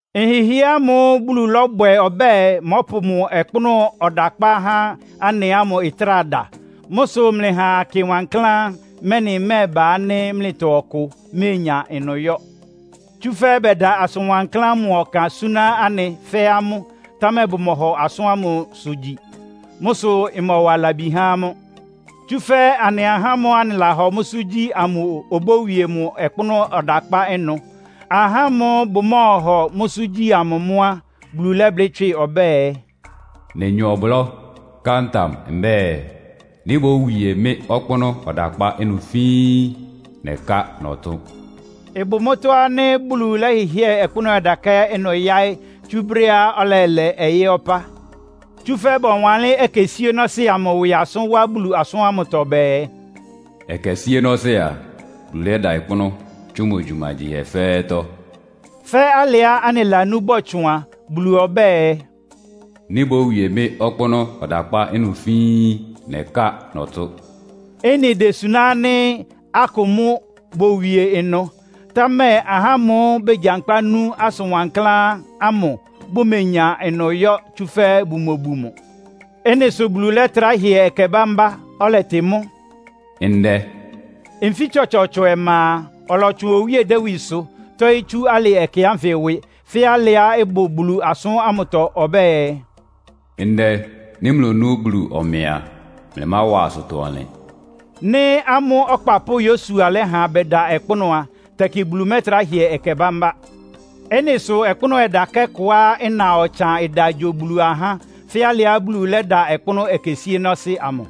Nhɩhɩɛ́ ámʋ́ʋ́ Bulu lɔ́bwɛ ɔbɛ́ɛ, mɔ́pʋ mʋ ɔkpʋ́nʋ́ ɔdakpá há anɩ ámʋ ɩtráa da. Mʋ́ sʋ mlɩha akɩ wankláán, mɛ́nɩ ɩmɛ́ɛba ánɩ́ mlɩtɔ ɔkʋ oméenya ɩnʋ yɔ́. Tsúfɛ́ bɛda asʋn wankláán ámʋ ɔkan súná anɩ, fɛ́ amʋ́, támɛ bʋmɔhɔ asʋ́n ámʋsʋ gyi. Mʋ́ sʋ ɩmɔwa labi há amʋ́. Tsúfɛ́ anɩ ahá ámʋ́ʋ́ anɩlahɔ mʋ́sʋ́ gyi amʋ obówie mʋ ɔkpʋ́nʋ́ ɔdakpá ɩnʋ. Ahá amʋ́ʋ́ bʋmɔ́ɔhɔ mʋ́sʋ́ gyi amʋ mʋ́ á, Bulu lɛ́blɩ́ tswɩ́ ɔbɛ́ɛ, “Nenya ɔblɔ́, ká ntam mbɛ́ɛ, ‘Nɩ́ bówie mɩ́ ɔkpʋ́nʋ́ ɔdakpá ɩnʋ fíín! Nɛká nɔtʋ́n!’” Ɩbʋ mʋ́tɔ́ ánɩ́ Bulu lɛ́hɩhɩ́ɛ ɔkpʋ́nʋ́ ɔdakpá ɩnʋ yáɩ́ tsú brɛ́á ɔlɛlɛ ɔyɩ́ ɔpá. Tsúfɛ́ bɔwanlɩ́n ɛkɛ síénɔ́sɩ́ amʋ ɩwɩ asʋ́n wá Bulu asʋn ámʋtɔ bɛɛ, “Ɛkɛ síénɔ́sɩ́ a, Bulu lɛ́da ɔkpʋ́nʋ́ tsú mʋ gyumagyihɛ fɛ́ɛ́tɔ́.” Fɛ́ alɩá anɩlanú bɔtsʋn a, Bulu ɔbɛ́ɛ, “Nɩ́ bówie mɩ́ ɔkpʋ́nʋ́ ɔdakpá ɩnʋ fíín! Nɛká nɔtʋ́n!” Ɩ́nɩ désuná ánɩ́ akʋ mʋ́ bówie ɩnʋ. Támɛ ahá ámʋ́ʋ́ begyankpá nú asʋn wankláán ámʋ bʋmenya ɩnʋ yɔ́, tsúfɛ́ bʋmobu mʋ. Ɩ́nɩ sʋ Bulu lɛ́trá hɩɛ ɛkɛ bámbá, ɔlɛtɩ mʋ́ “Ndɛ.” Nfí tsɔtsɔɔtsɔ ɔma a, ɔlɔtsʋn Owíe Dawidsʋ tɔ́ɩ́ tsú alɩ ɛkɛ ánfɩ ɩwɩ, fɛ́ alɩá ɩbʋ Bulu asʋ́n ámʋtɔ ɔbɛ́ɛ, “Ndɛ, nɩ́ mlonú Bulu ɔmɛ a, mlɩmáwa asʋtɔ-ɔnlɩn.” Nɩ́ amʋ́ ɔkpapʋ́ Yosua lɛ́ha bɛda ɔkpʋ́nʋ́ á, tɛkɩ Bulu mɛ́trá hɩɛ ɛkɛ bámbá. Ɩ́nɩ sʋ ɔkpʋ́nʋ́ ɔdakɛ́ kʋá ɩna ɔtsan ɩda gyo Bulu ahá, fɛ́ alɩá Bulu lɛ́da ɔkpʋ́nʋ́ ɛkɛ síénɔ́sɩ́ amʋ.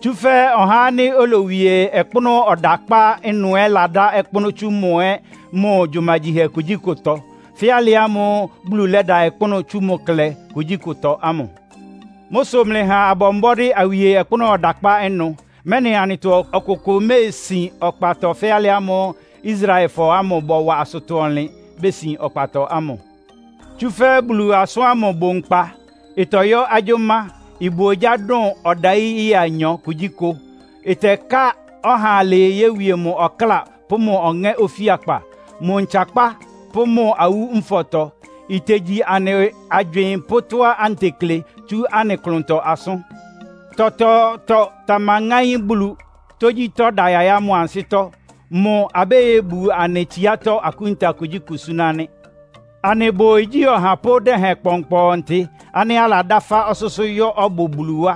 Tsúfɛ́ ɔhá ánɩ́ olowie ɔkpʋ́nʋ́ ɔdakpá ɩnʋ ɛ́ ladá ɔkpʋ́nʋ́ tsú mʋ ɛ́ mʋ gyumagyihɛ kugyíkʋtɔ, fɛ́ alɩ ámʋ́ʋ́ Bulu lɛ́da ɔkpʋ́nʋ́ tsú mʋ klɛ kugyíkʋtɔ ámʋ. Mʋ́ sʋ mlɩha abɔ mbɔ́dɩ́ awie ɔkpʋ́nʋ́ ɔdakpá ɩnʋ, mɛ́nɩ anɩtɔ ɔkʋkʋ méesin ɔkpatɔ fɛ́ alɩ ámʋ́ʋ́ Israelfɔ ámʋ bɔwa asʋtɔ-ɔnlɩn, besin ɔkpatɔ ámʋ. Tsúfɛ́ Bulu asʋ́n ámʋ ɩbʋ nkpa, ɩtɔyɔ́ agyʋ́má. Ɩbʋ ogyá dʋn ɔdayí ɩya anyɔ kugyíkʋ. Ɩtɛká ɔha alɩɩ yówie mʋ ɔkláa pʋ́ mʋ́ ɔŋɛ́ ofíakpa, mʋ ntsakpá pʋ́ mʋ awú nfɔtɔ. Itegyi anɩ agywɩɩn pʋ́ tɔ́á anɩtekle tsú anɩ klʋntɔ asʋ́n. Tɔtɔɔtɔ tamaŋáín Bulu! Tógyítɔ́ da yayá mʋ ansɩ́tɔ́. Mʋ abóyóbu anɩ tsiátɔ́ akúnta kugyíkʋ súná nɩ́. Anɩbʋ igyí ɔhapʋ́ dɛhɛn kpɔnkpɔntɩ ánɩ́ aladá fá ɔsʋ́sʋ́ yɔ́ ɔbʋ Bulu wá.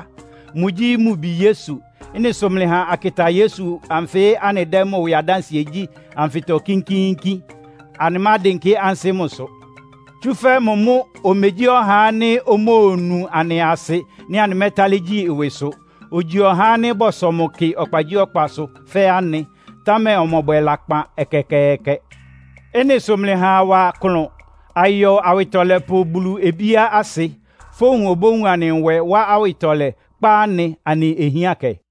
Mʋgyí mʋ Bi Yesu. Ɩ́nɩ sʋ mlɩha akɩta Yesu anfɩ́ anɩdɛ́ mʋ ɩwɩ adánsɩɛ gyí anfɩtɔ kínkíínkín. Anɩmádɩnkɩ́ ansɩ́ mʋsʋ. Tsúfɛ́ mʋ mʋ́ omegyí ɔhá ánɩ́ omóonu anɩ asɩ nɩ́ anɩmɛ́tálɩ́ gyí ɩwɩsʋ. Ogyi ɔhá ánɩ́ bɔsɔ mʋ kɩ ɔkpagyíɔkpasʋ fɛ́ anɩ, támɛ ɔmɔbwɛ lakpan ɛkɛkɛɛkɛ. Ɩ́nɩ sʋ mlɩha awa klʋn, ayɔ Awɩtɔlɛpʋ Bulu obíá asɩ. Fówun obówun anɩ nwɛ, wá awɩtɔlɛ, kpá anɩ anɩ ohiánkɛ.